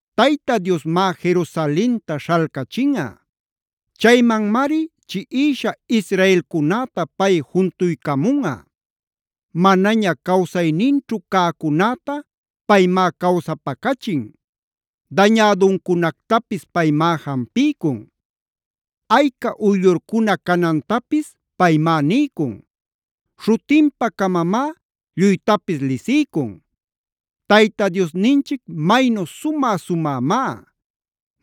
Tayta Diosmá Jerusalenta śhalcachinꞌa. Chaymanmari chiꞌisha israelcunäta pay juntuycamunꞌa. Manaña cawsayninćhu cäcunäta paymá cawsapacachin. Dañäduncunactapis paymá jampiycun. Ayca uyllurcuna canantapis paymá niycun. Śhutinpa-camamá lluytapis lisiycun. Tayta Diosninchic maynu sumä-sumämá.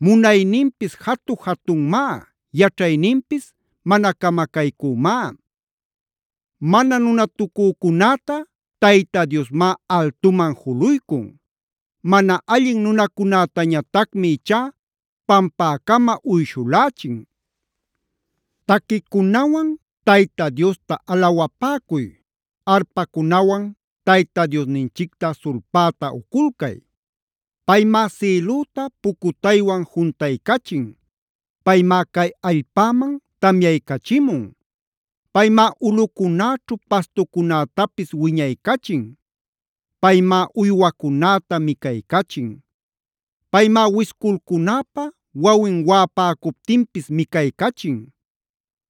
Munayninpis jatu-jatunmá, yaćhayninpis mana camacaycümá. Mana nunatucücunäta Tayta Diosmá altuman juluycun. Mana allin nunacunätañatacmi ichá pampäcama uyshulächin. Taquicunawan Tayta Diosta alawapäcuy. Arpacunawan Tayta Diosninchicta sulpäta uculcay. Paymá sïlüta pucutaywan juntaycachin. Paymá cay allpäman tamyaycachimun. Paymá ulꞌucunäćhu pastucunätapis wiñaycachin. Paymá uywacunäta micaycachin. Paymá wisculcunäpaa wawin waꞌapäcuptinpis micaycachin.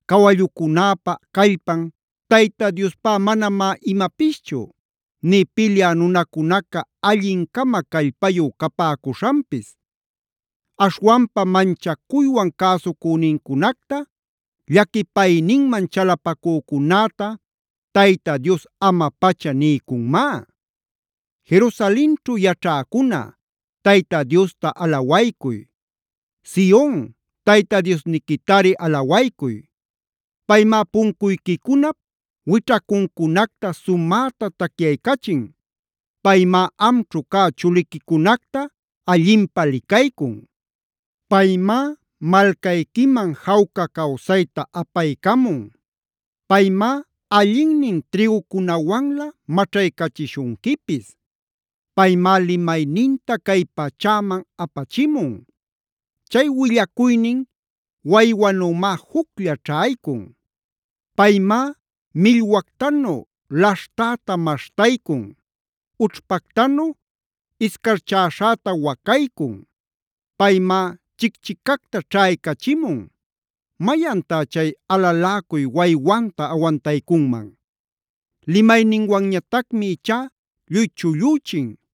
Cawallucunäpa callpan Tayta Diospá manamá imapischu nï pilyä nunacunaca allin-cama callpayu capäcuśhanpis. Aśhwanpa manchacuywan cäsucünincunacta, llaquipayninman chalapacücunäta Tayta Dios ama-pacha niycunmá. Jerusalenćhu yaćhäcuna, Tayta Diosta alawaycuy. Sion, Tayta Diosniquitari alawaycuy. Paymá puncuyquicunap wićhacuncunacta sumäta tacyaycachin. Paymá amćhu cä chuliquicunacta allinpä licaycun. Paymá malcayquiman jawca cawsayta apaycamun. Paymá allinnin trïgucunawanlä maćhaycachishunquipis. Paymá limayninta cay pachäman apachimun. Chay willacuynin waywanümá juclla ćhaycun. Paymá millwactanu laśhtäta maśhtaycun. Ućhpactanu iscarchäśhäta wacaycun. Paymá chicchicacta ćhaycachimun. ¿Mayantá chay alaläcuy waywanta awantaycunman? Limayninwanñatacmi ichá lluy chullüchin.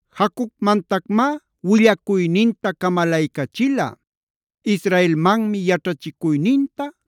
Jacobmantacmá willacuyninta camalaycachila. Israelmanmi yaćhachicuyninta,